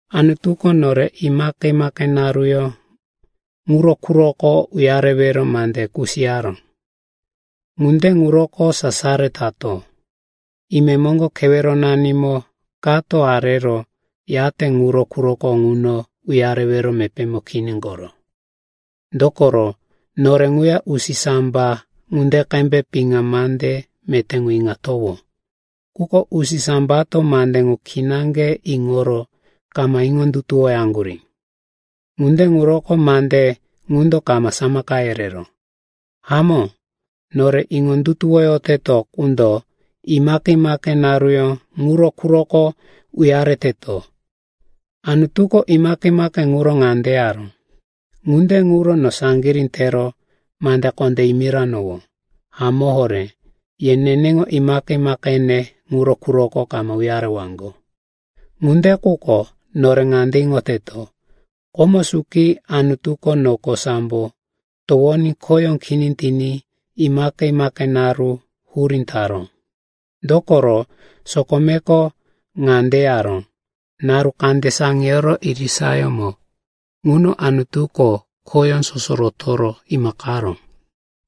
Anutuko nore imaqe-imaqe naruyó ŋuro quroko uyarewero mande kusiyaró. Ŋunde ŋuroko sasaro tato. Imemoŋgo keweronanimo kato arero yate ŋuro quroko ŋuno uyarewero mepémo kini koro. Dokoro nore ŋuya usisamba ŋunde qembe piŋa mande meté ŋu iŋatowó. Quko usisambato mande ŋu kinaŋge iŋoro kama iŋondutuwoyaŋgurí. Ŋunde ŋuroko mande ŋundo kama samaka yereró. Hamó, nore iŋondutuwoyoteto qundo imaqe-imaqe naruyó ŋuro quroko uyareteto. Anutuko imaqe-imaqe ŋuro ŋande yaró, “Ŋunde ŋuro no saŋgirí tero mande kondé yimiranowó, ‘Hamó horé, ye neneŋo imaqe-imaqene ŋuro quroko kama uyarewaŋgo.’” Ŋunde quko nore ŋande iŋoteto, komo suki Anutuko noko sambo towoní khoyó kini tiní imaqe-imaqe naru hurí taró. Dokoro sokomeko ŋande yaró, “Naru kande saŋiyoro irisayómo ŋuno Anutuko khoyó soso rotoro imaqaró.”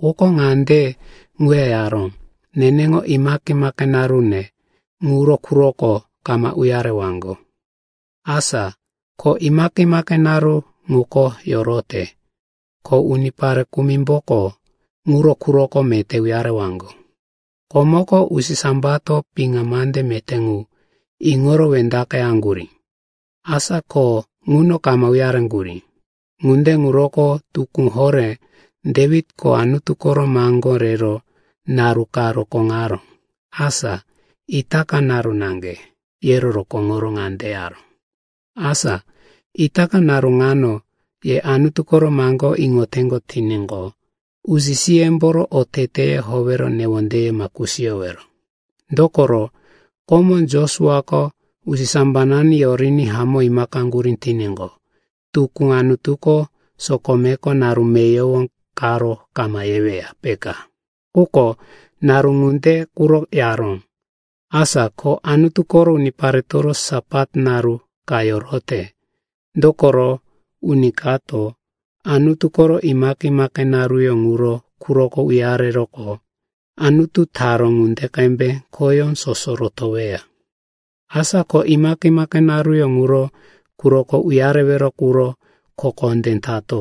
Quko ŋande ŋuya yaró, “Neneŋo imaqe-imaqe narune ŋuro quroko kama uyarewaŋgo.” Asa ko imaqe-imaqe naru ŋuko yorote, ko unipare kumimboko ŋuro quroko meté uyarewaŋgo. Komoko usisambato piŋa mande meté ŋu iŋoro wendaqeyaŋgurí. Asa ko ŋuno kama uyareŋgurí. Ŋunde ŋuroko tukú horé Dewitko Anutu koro maŋgó rero naru ka rokóŋaró, asa “Itaka naru naŋge,” yero rokóŋoro ŋande yaró, “Asa itaka naru ŋano ye Anutu koro maŋgó iŋoteŋgo tiníqo, usi-siyemboro oteteye howero newondeye ma kusiyowero.” Dokoro komo Josuako usisambanani yoriní hamó imaqeyaŋgurí tiníqo, tukú Anutuko sokomeko naru meyowo karo kama yeweya, peka. Quko naru ŋunde quro yaró. Asa ko Anutu koro uniparetoro Sapat naru ka yorote. Dokoro uni kato Anutu koro imaqe-imaqe naruyó ŋuro quroko uyareroqo, Anutuko taró ŋunde qembe khoyó soso rotoweya. Asa ko imaqe-imaqe naruyó ŋuro quroko uyarewero quro kho kondé tato.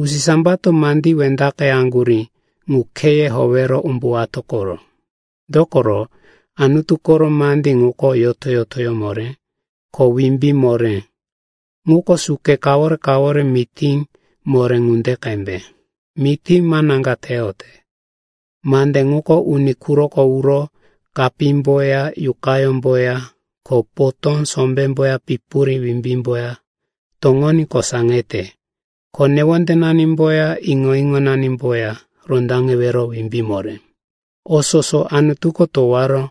Usisambato mandí wendaqeyaŋgurí ŋu kheye howero umbuwato koro. Dokoro Anutu koro mandí ŋuko yoto-yotoyó moré, ko wimbí moré. Ŋuko suke kawore-kawore mití moré ŋunde qembe, mití manaŋga teyote. Mande ŋuko uni quroko uro kapímboya yuqayómboya ko potó sombémboya pipuri wimbímboya toŋoní kosaŋete. Ko newondenanimboya iŋo-iŋonanimboya rondaŋewero wimbí moré. O soso Anutuko towaró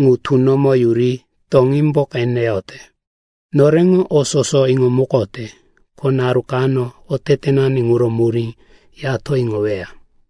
ŋu tunomo yuri toŋímbo qeneyote. Noreŋo o soso iŋomukote, ko naru kano otetenani ŋuro murí yato iŋoweya.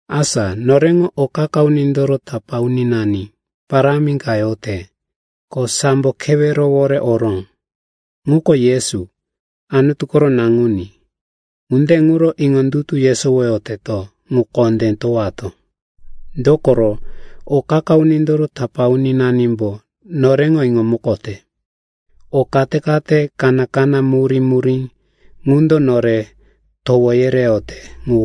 Asa noreŋo o qa-qa unindoro tapá uninani parámi ka yote, ko sambo kewerowore oró. Ŋuko Yesu, Anutu koro Naŋuní. Ŋunde ŋuro iŋondutu yesowoyoteto ŋu kondé towato. Dokoro o qa-qa unindoro tapá uninanimbo noreŋo iŋomukote. O kate-kate kaná-kaná murí-murí ŋundo nore towo yereyote ŋu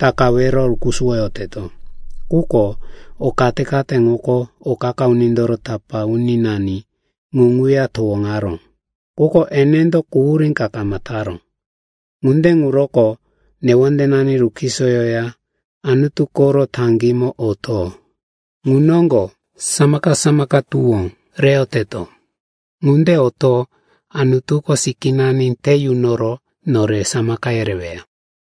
takawero rukusuwoyoteto. Quko o kate-kate ŋuko o qa-qa unindoro tapá uninani ŋu ŋuya towoŋaró, quko enendo quhurí ka kama taró. Ŋunde ŋuroko newondenani rukisoyoya Anutu koro taŋgímo oto. Ŋu noŋgo samaka-samaka tuwó reyoteto. Ŋunde oto Anutuko sikínani te yunoro nore samaka yereweya.